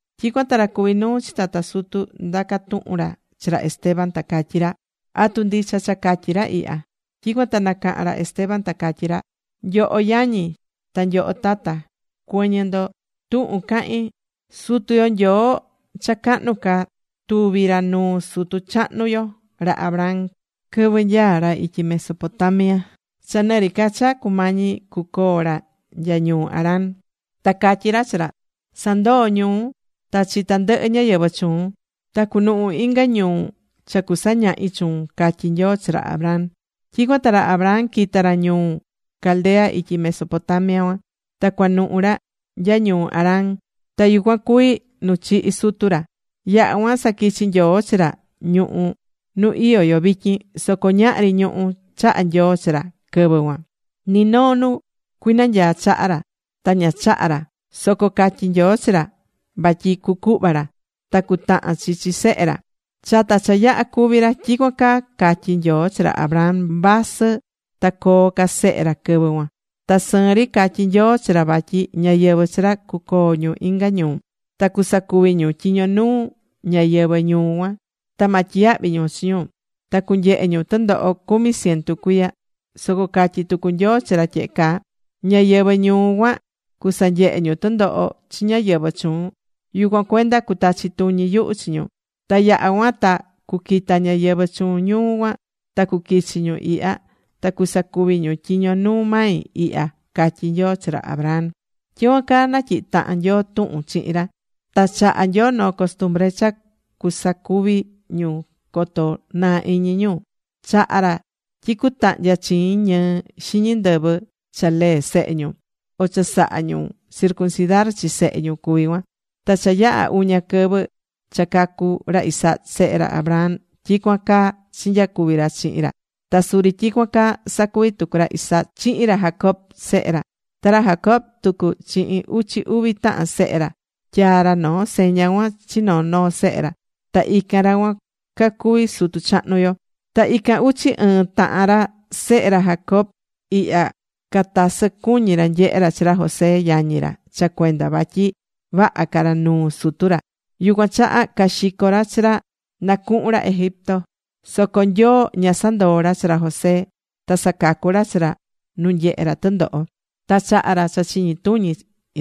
Tyicuan ta ra cuví nuu chi tata sutu ndaca̱ tuhun ra chi ra Esteban, ta catyí ra: ―¿Atu ndicha cha catyi̱ ra ihya? Tyicuan ta nacaha̱n ra Esteban ta catyí ra: ―Nyoho yañi, ta nyoho tata, cuɨ̱ñɨ ndo tuhun cahín. Sutu yo Nyoo cha cahnu ca tuvi̱ ra nuu sutu chahnu yo, ra Abraham quɨvɨ nyaá ra ityi Mesopotamia cha nɨri ca cha cumañi cucoo ra nya ñuu Harán. Ta catyí ra chi ra: “Sa̱ndoo ñuun, ta chi tandɨhɨ ñáyɨvɨ chuun. Ta cu̱nuhu inga ñuu cha cusañahi chuun”, catyí Nyoo chi ra Abraham. Tyicuan ta ra Abraham quita̱ ra ñuu Caldea ityi Mesopotamia cuan, ta cuanuhu̱ ra nya ñuu Harán. Ta yucuan cuví nu chihi̱ sutu ra. Yaha cuan saquichi̱ Nyoo chi ra ñuhú nu iyó yo vityin. Soco ñahri ñuhú chaha̱ Nyoo chi ra quɨvɨ cuan. Ni noo nu cuinanyaa chaha ra ta ña chaha̱ ra. Soco catyi̱ Nyoo chi ra vatyi cucuhva ra. Ta cutahan chi chi sehe ra chata cha yaha cúvi ra. Tyicuan caa catyi̱ Nyoo chi ra Abraham, vasɨ ta coo ca sehe ra quɨvɨ cuan. Ta sɨɨn ri catyi̱ Nyoo chi ra vatyi ñáyɨvɨ chi ra cucoo ñu inga ñuu. Ta cusacuvi ñu tyiño nuu ñáyɨvɨ ñuu cuan, ta ma tyiyahvi ñu chi ñu. Ta cunyehe ñu tɨndoho cumi cientu cuiya. Soco catyi̱ tucu Nyoo chi ra tyehe caa: “Ñáyɨvɨ ñuu cuan cusanyehe ñu tɨndoho chi ñáyɨvɨ chuun. Yucuan cuenda cuatachi tuñi yuhu chi ñu. Ta yaha̱ cuan ta cuquita ñáyɨvɨ chuun ñuu cuan ta cuquichi ñu ihya. Ta cusacuvi ñu tyiño nuu mai ihya”, catyi̱ Nyoo chi ra Abraham. ’Tyicuan caa natyihi̱ tahan Nyoo tuhun chihin ra. Ta chaha̱ Nyoo noo costumbre cha cuasacuvi ñu coto naa iñi ñu. Chaha̱ ra tyi cutahnya chiin ñɨɨ xiñi ndɨvɨ cha lee sehe ñu, o cha sahá ñu circuncidar chi sehe ñu cuví cuan. Ta cha yaha̱ uña quɨvɨ cha cacu̱ ra Isaac sehe ra Abraham, tyicuan caa chinyacuvi̱ ra chihin ra. Ta suri tyicuan caa sacuvi̱ tucu ra Isaac chihin ra Jacob sehe ra. Ta ra Jacob tucu chihin uchi uvi tahan sehe ra, tyaa ra noo seña cuan chi noo noo sehe ra. Ta ican ra cuan cacuví sutu chahnu yo. ’Ta ican uchi ɨɨ́n tahan ra sehe ra Jacobo ihya catasɨ cuñí ra nyehe ra chi ra José yañi ra cha cuenda vatyi vaha ca ra nuu sutu ra. Yucuan chaha caxico̱ ra chi ra na cuhun ra Egipto. Soco Nyoo ña sandoó ra chi ra José. Ta sacacu̱ ra chi ra nu nyehé ra tɨndoho. Ta chaha̱ ra cha chiñi tuñi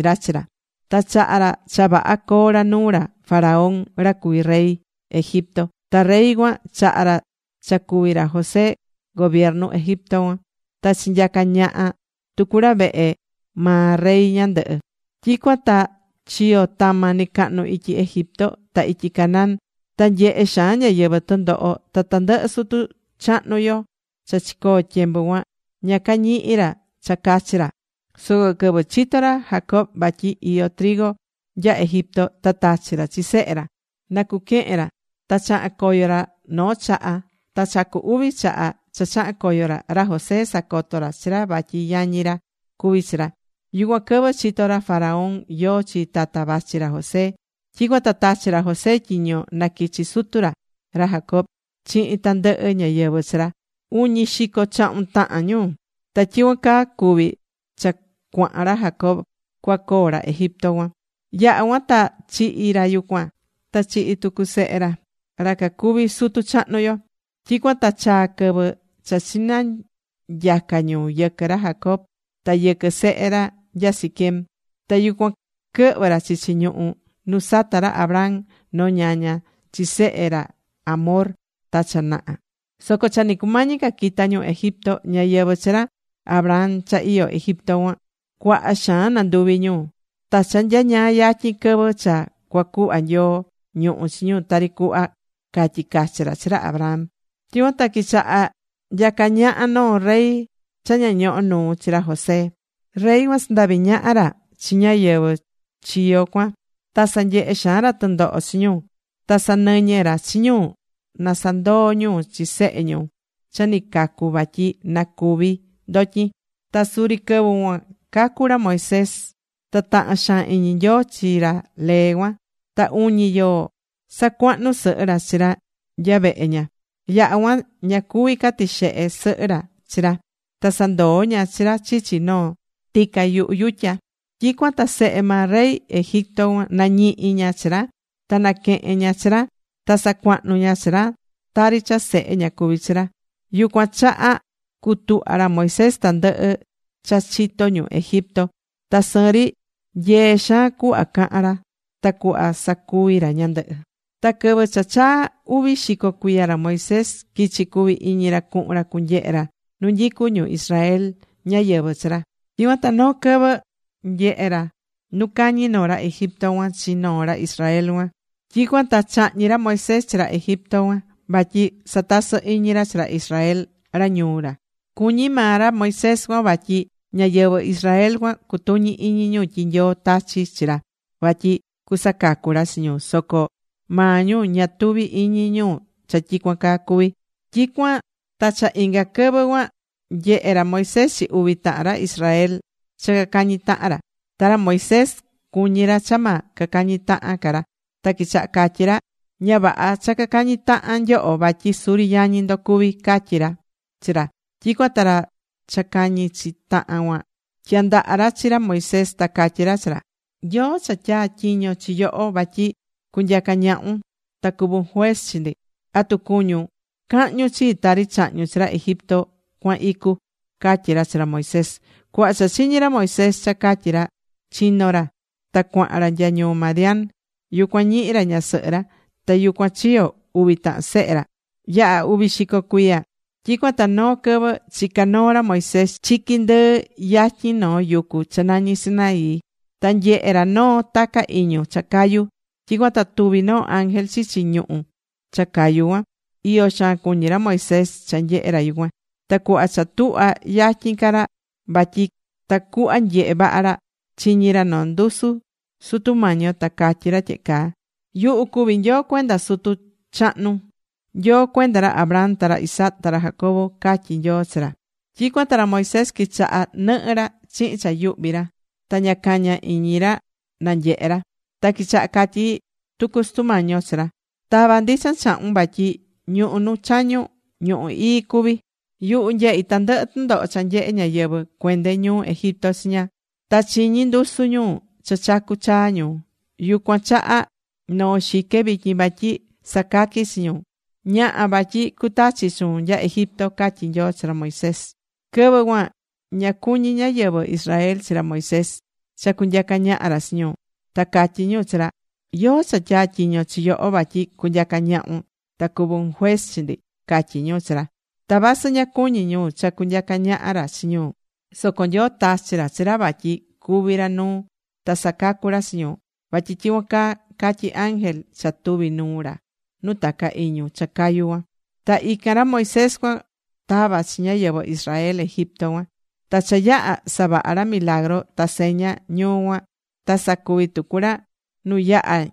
ra chi ra. Ta chaha̱ ra cha vaha coo ra nuu ra Faraón, ra cuví rey Egipto. Ta rey cuan chaha̱ ra cha cuvi ra José gobiernu Egipto cuan. Ta chinyaca̱ ñaha tucu ra vehe maa rey ñandɨhɨ. ’Tyicuan ta chiyo̱ tama nɨcahnu ityi Egipto ta ityi Canaán. Ta nyehe̱ xaan ñáyɨvɨ tɨndoho. Ta tandɨhɨ sutu chahnu yo cha chicoo tyembu cuan ña cañihi̱ ra cha cachi ra. Soco quɨvɨ chito̱ ra Jacob vatyi iyó nya Egipto, ta tachi̱ ra chi sehe ra na cuquehen ra. Ta chaha̱n coyo ra noo chaha. Ta cha cu uvi chaha cha chaha̱n coyo ra, ra José sacoto̱ ra chi ra vatyi yañi ra cuví chi ra. Yucuan quɨvɨ chito̱ ra Faraón yóó chi tata vachi ra José. Tyicuan ta tachi̱ ra José tyiño na quichi sutu ra, ra Jacob, chihin tandɨhɨ ñáyɨvɨ chi ra, uñi xico chahun tahan ñu. Ta tyicuan caa cuvi cha cuahan ra Jacob cuacoo ra Egipto cuan. Yaha̱ cuan ta chihi̱ ra yucuan. Ta chihi̱ tucu sehe ra, ra cacuví sutu chahnu yo. Tyicuan ta chaa̱ quɨvɨ cha chinanyaca̱ ñu yɨquɨ ra Jacob ta yɨquɨ sehe ra nya Siquem. Ta yucuan quɨhvɨ ra chichi ñuhú nu sata̱ ra Abraham noo ñaña chi sehe ra Hamor ta cha naha. ’Soco cha ni cumañi ca quita ñu Egipto, ñáyɨvɨ chi ra Abraham cha iyó Egipto cuan cuaha xaan nanduvi ñu. Ta cha nyañaa yatyin quɨvɨ cha cuacuhva Nyoo ñuhú chi ñu tari cuhva catyi̱ cachi ra chi ra Abraham. Tyicuan ta quichaha̱ nyaca ñaha noo rey cha ña ñohó nuu chi ra José. Rey cuan sandavi̱ ñaha ra chi ñáyɨvɨ chi yo cuan. Ta sanyehe̱ xaan ra tɨndoho chi ñu, ta sanɨñɨ̱ ra chi ñu na sanandoo ñu chi sehe ñu cha ni cacu vatyi na cúvi ndotyin. Ta suri quɨvɨ cuan cacu̱ ra Moisés. Ta tahan xaan iñi Nyoo chi ra lee cuan. Ta uñi yoo sacuahnu̱ sɨhɨ ra chi ra nya vehe ña. Yaha cuan ña cuví ca tixehe sɨhɨ ra chi ra. Ta sandoo ña chi ra chichi noo tica yuhu yutya. Tyicuan ta sehe maa rey Egipto cuan nañihi̱ ña chi ra. Ta naquehe̱n ña chi ra. Ta sacuahnu̱ ña chi ra, tari cha sehe ña cuví chi ra. Yucuan chaha cutuhva̱ ra Moisés tandɨhɨ cha chitó ñu Egipto. Ta sɨɨn ri nyee xaan cuhva cahan ra, ta cuhva sacuví ra ñandɨhɨ. ’Ta quɨvɨ cha chaa̱ uvi xico cuiya ra Moisés quichi cuvi iñi ra cuhun ra cunyehe ra nu nyicú ñu Israel, ñáyɨvɨ chi ra. Tyicuan ta noo quɨvɨ nyehe̱ ra nu cañí noo ra Egipto cuan chi noo ra Israel cuan. Tyicuan ta chahñi̱ ra Moisés chi ra Egipto cuan vatyi satasɨ iñi ra chi ra Israel ra ñuu ra. Cuñí maa ra Moisés cuan vatyi ñáyɨvɨ Israel cuan cutuñi iñi ñu tyi Nyoo tachi̱ chi ra vatyi cusacacu ra chi ñu. Soco maa ñu ña tuví iñi ñu cha tyicuan caa cucuvi. Tyicuan ta cha inga quɨvɨ cuan nyehé ra Moisés chi uvi tahan ra Israel cha cacañí tahan ra. Ta ra Moisés, cuñi ra cha ma cacañi tahan ca ra, ta quichaha catyi ra: “Ña vaha cha cacañi tahan nyoho, vatyi suri yañi ndo cuvi”, catyi ra chi ra. Tyicuan ta ra cha cañí chi tahan cuan tyandaha̱ ra chi ra Moisés, ta catyi ra chi ra: “¿Yóó cha tyatyiño chi yoho vatyi cunyaca ñahun ta cuvun juez chi ndi? ¿Atu cuñun cahñun chii tari chahñu̱n chi ra Egipto cuan icu?” catyi ra chi ra Moisés. Cuhva cha chiñi̱ ra Moisés cha catyi̱ ra, chino̱ ra. Ta cuahan ra nya ñuu Madián. Yucuan ñihi̱ ra ñasɨhɨ ra. Ta yucuan chiyo̱ uvi tahan sehe ra. ’Yaha̱ uvi xico cuiya. Tyicuan ta noo quɨvɨ chicá noo ra Moisés chiqui ndɨɨ yatyin noo yucu cha nañí Sinaí. Ta nyehe̱ ra noo taca iñu cha cayú. Tyicuan ta tuvi noo ángel chichi ñuhu̱ cha cayu cuan. Iyo xaan cuñí ra Moisés cha nyehé ra yucuan. Ta cuhva cha tuhva̱ yatyin ca ra vatyi tacuhva nyehe vaha ra, chiñi̱ ra noo ndusu Sutu Mañi yo. Ta catyí ra tyehe caa: “Yuhu cuví Nyoo cuenda sutu chahnun, Nyoo cuenda ra Abraham, ta ra Isaac, ta ra Jacob”, catyí Nyoo chi ra. Tyicuan ta ra Moisés quichaha̱ nɨhɨ ra chihin cha yuhvi ra. Ta ña caña iñi ra nanyehe ra. Ta quichaha catyi tucu Sutu Mañi yo chi ra: “Ta̱va ndichan chahun vatyi ñuhú nu chañun, ñuhú ii cuví. Yuhu nyehí tandɨhɨ tɨndoho cha nyehé ñáyɨvɨ cuende ñuu Egipto chiña. Ta chiñí ndusu ñu cha chacú chaa ñu. Yucuan chaha noó xique vityin vatyi sacaqui chi ñu. Ña̱ha, vatyi cutachi chuun nya Egipto”, catyí Nyoo chi ra Moisés. ’Quɨvɨ cuan ña cuñi̱ ñáyɨvɨ Israel chi ra Moisés cha cunyaca ñaha ra chi ñu, ta catyi̱ ñu chi ra: “¿Yóó cha tyatyiño̱ chi yoho vatyi cunyaca ñahun ta cuvun juez chi ndi?”, catyi̱ ñu chi ra. Ta vasɨ ña cuñi̱ ñu cha cunyaca ñaha ra chi ñu, soco Nyoo tachi̱ chi ra vatyi cuvi ra nuu, ta sacacu ra chi ñu. Vatyi tyicuan caa catyí ángel cha tuvi̱ nuu ra nu taca iñu cha cayu cuan. Ta ican ra Moisés cuan tava̱ chi ñáyɨvɨ Israel Egipto cuan. Ta cha yaha savaha̱ ra milagru ta seña ñuu cuan, ta sacuvi̱ tucu ra nu yaha̱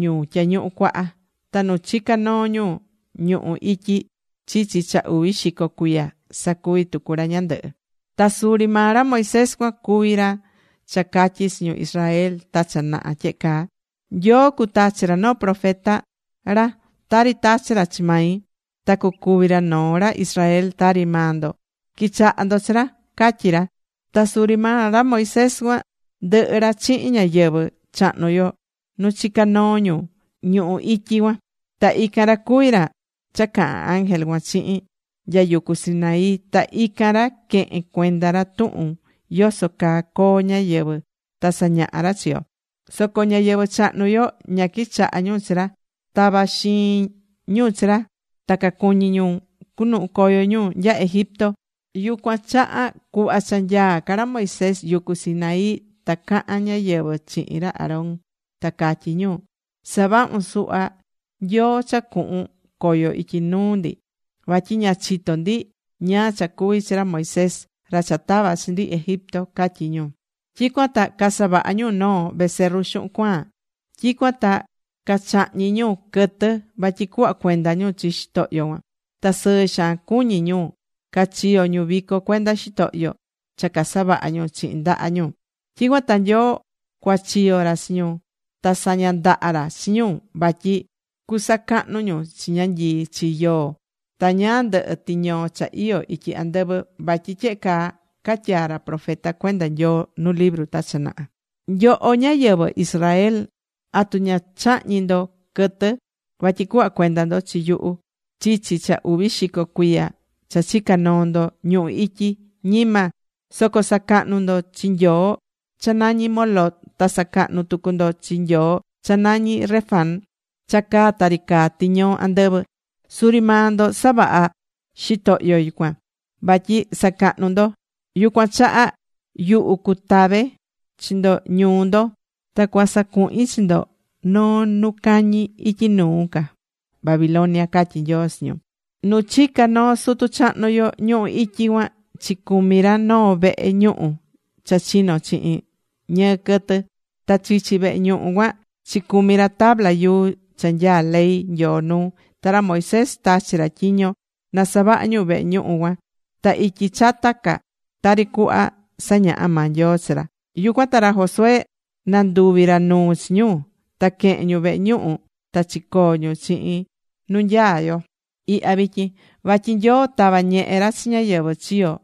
ñu Tyañuhu Cuaha. Ta nu chica̱ noo ñu ñuhú ityi chichi cha uvi xico cuiya sacuvi̱ tucu ra ñandɨhɨ. Ta suri maa ra Moisés cuan cuví ra cha catyi̱ chi ñu Israel ta cha naha tyehe caa: “Nyoo cutachi ra noo profeta ra tari tachi̱ ra chi mai. Ta cucuvi ra noo ra Israel tari maa ndo. Qui̱chaha ndo chi ra”, catyí ra. Ta suri maa ra Moisés cuan ndɨhɨ ra chihin ñáyɨvɨ chahnu yo nu chica noo ñu ñuhú ityi cuan. Ta ican ra cuví ra cha caha̱n ángel cuan chihin nya yucu Sinaí. Ta ican ra quehe̱n cuenda ra tuhun yoso caa coo ñáyɨvɨ ta sañaha̱ ra chi yo. ’Soco ñáyɨvɨ chahnu yo ña quichaha̱ ñu chi ra. Tava̱ xiin ñu chi ra. Ta cacuñi ñu cunuhu coyo ñu nya Egipto. Yucuan chaha cuhva cha nyaá ca ra Moisés yucu Sinaí ta caha̱n ñáyɨvɨ chihin ra Aarón ta catyí ñu: “Sa̱vahun suhva nyoo cha cuhun coyo ityi nuu ndi. Vatyi ña chitó ndi ñáá cha cuvi̱ chi ra Moisés, ra cha tava̱ chi ndi Egipto”, catyi ñu. Tyicuan ta casavaha̱ ñu noo becerru xuhun cuaan. Tyicuan ta cachahñi̱ ñu quɨtɨ vatyi cuhva cuenda ñu chi xitohyo cuan. Ta sɨɨ xaan cuñi̱ ñu cachiyo̱ ñu vico cuenda xitohyo cha casavaha ñu chihin ndaha ñu. Tyicuan ta Nyoo cuachiyo̱ ra chi ñu. Ta saña̱ ndaha ra chi ñu vatyi cusacahnu ñu chi ñanyii, chi yoo, ta ñáá ndɨhɨ tiñoo cha iyó ityi andɨvɨ. Vatyi tyehe caa catyaa̱ ra profeta cuenda Nyoo nu libru ta cha naha: Nyoho ñáyɨvɨ Israel, ¿atu chahñi̱ ndo quɨtɨ vatyi cuhva cuenda ndo chi yuhu chichi cha uvi xico cuiya cha chica noo ndo ñuhu ityi? Ñima. Soco sacahnu̱ ndo chi nyoo cha nañí Moloc, ta sacahnu̱ tucu ndo chi nyoo cha nañí Renfán cha caá tari caá tiñoo andɨvɨ. Suri maa ndo savaha̱ xitohyo cuan, vatyi sacahnu ndo. Yucuan chaha yuhu cuatave chi ndo ñuu ndo, ta cuasacuhin chi ndo noo nu cañi ityi nuu ca Babilonia, catyi̱ Nyoo chi ñu. ’Nu chicá noo sutu chahnu yo ñuhú ityi cuan, chicumi ra noo vehe ñuhu cha chino̱ chihin ñɨɨ quɨtɨ. Ta chichi vehe cuan chicumi ra tabla yuu cha nyaá ley Nyoo nuu. Ta ra Moisés tachi̱ ra tyiño na savaha ñu vehe ñuhu cuan ta ityi chata ca tari cuhva sañaha̱ maa Nyoo chi ra. Yucuan ta ra Josué nanduvi̱ ra nuu chi ñu. Ta quehe̱n ñu vehe ñuhu ta chicoo ñu chihin nu nyaá yo ihya vityin. Vatyi Nyoo tava̱ ñehe ra chi ñáyɨvɨ chiyo̱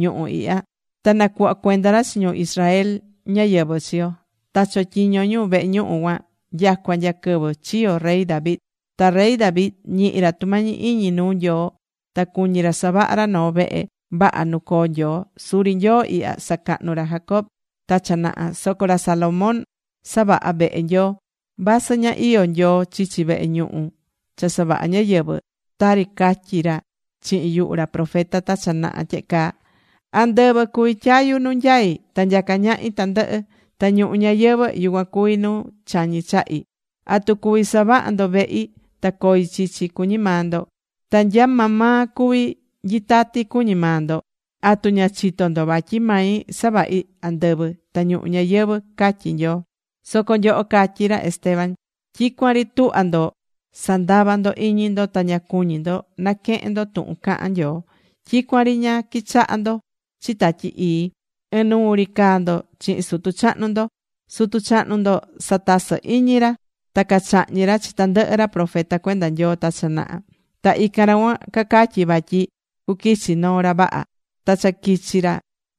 ñuhu ihya ta nacuhva̱ cuenda ra chi ñu Israel ñáyɨvɨ chi yo. Ta chotyiño̱ ñu vehe ñuhu cuan nyacua nya quɨvɨ chiyo̱ rey David. Ta rey David ñihi̱ ra tumañi iñi nuu Nyoo. Ta cuñi̱ ra savaha ra noo vehe vaha nu coo Nyoo. Suri Nyoo ihya sacahnu̱ ra Jacob ta cha naha. Soco ra Salomón savaha̱ vehe Nyoo. Vasɨ ña iyó Nyoo chichi vehe ñuhu cha savahá ñáyɨvɨ. Tari catyi̱ ra chihin yuhu ra profeta ta cha naha tyehe caa: Andɨvɨ cuví tyayu nu nyaí ta nyacá ñahi tandɨhɨ. Ta ñuhu ñayɨvɨ̱, yucuan cuví nu chañí chahi. ¿Atu cuví savaha ndo vehi ta coi chichi, cuñí maa ndo? ¿Ta nya maa maa cuvi nyitati, cuñí maa ndo? ¿Atu ña chitó ndo vatyi mai savahi andɨvɨ ta ñuhu ñayɨvɨ̱? catyí Nyoo. ’Soco nyoho ―catyí ra Esteban― tyicuan ri tuhvá ndo sandava ndo iñi ndo. Ta ña cuñí ndo naquehen ndo tuhun cahán Nyoo. Tyicuan ri ña quichahá ndo chi Tatyi Ii. Ɨnuu ri caa ndo chihin sutu chahnu ndo. Sutu chahnu ndo satasɨ̱ iñi ra ta cachahñi̱ ra chi tandɨhɨ ra profeta cuenda Nyoo ta cha naha. Ta ican ra cuan cacatyi̱ vatyi cuquichi noo ra vaha. Ta cha quichi̱ ra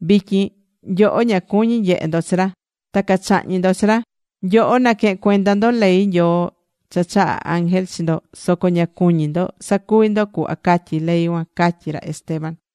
vityin, nyoho ña cuñí nyehe ndo chi ra, ta cachahñi̱ ndo chi ra. Nyoho naquehe̱n cuenda ndo ley Nyoo cha chaha̱ ángel chi ndo, soco ña cuñí ndo sacuvi ndo cuhva catyí ley cuan ―catyí ra Esteban.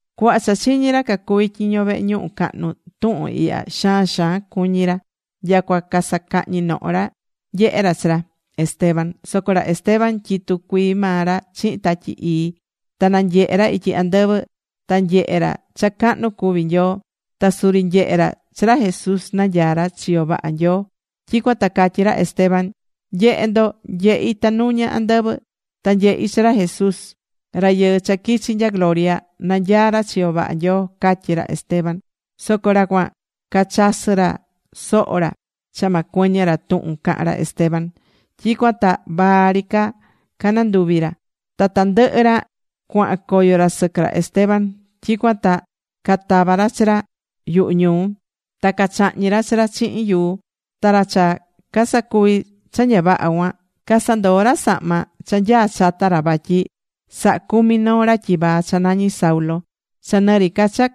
Cuhva cha chiñi̱ ra cacuví tyiño vehe ñuhu cahnu tuhun ihya, xaan xaan cuñi̱ ra, nyacua casacahñi noho ra nyehé ra chi ra Esteban. Soco ra Esteban tyitú cuii maa ra chihin Tatyi Ii ta nanyehé ra ityi andɨvɨ. Ta nyehé ra cha cahnu cuví Nyoo. Ta suri nyehe̱ ra chi ra Jesús nanyaá ra chiyo vaha Nyoo. Tyicuan ta catyí ra Esteban: ―¡Nye̱he ndo! Nyehí tanuña andɨvɨ. Ta nyehí chi ra Jesús, Rayɨɨ cha quichi̱ nya gloria, nanyaá ra chiyo vaha Nyoo ―catyí ra Esteban. Soco ra cuan cachasɨ ra soho ra, cha ma cuɨñɨ ra tuhun cahán ra Esteban. Tyicuan ta vaa ri cananduvi ra. Ta tandɨhɨ ra cuahan coyo ra sɨquɨ ra Esteban. Tyicuan ta catava̱ ra chi ra yuhu ñuu. Ta ca chahñi̱ ra chi ra chihin yuu. Ta ra cha casacuví cha ña vaha cuan, casandoo̱ ra sahma cha nyaa chata ra vatyi sahacumi noo ra tyivaa cha nañi Saulo. Cha nɨri ca cha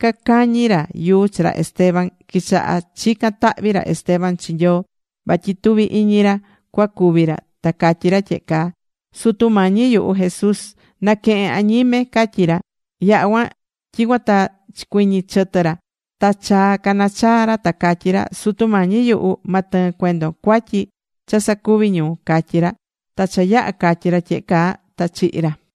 cacañi ra yuu chi ra Esteban, quichaha̱ chican tahvi ra Esteban chi Nyoo, vatyi tuvi iñi ra cuacúvi ra. Ta catyi ra tyehe caa: ―Sutu Mañi yuhu Jesús, na̱quehen añime ―catyí ra. Yaha̱ cuan, tyicuan ta chicuɨñɨ chɨtɨ ra, ta chaa canachaa̱ ra ta catyi ra: ―Sutu Mañi yuhu, ma tɨɨn cuendon cuatyi cha sacuví ñu ―catyí ra. Ta cha yaha̱ catyi ra tyehe caa, ta chihi̱ ri ra.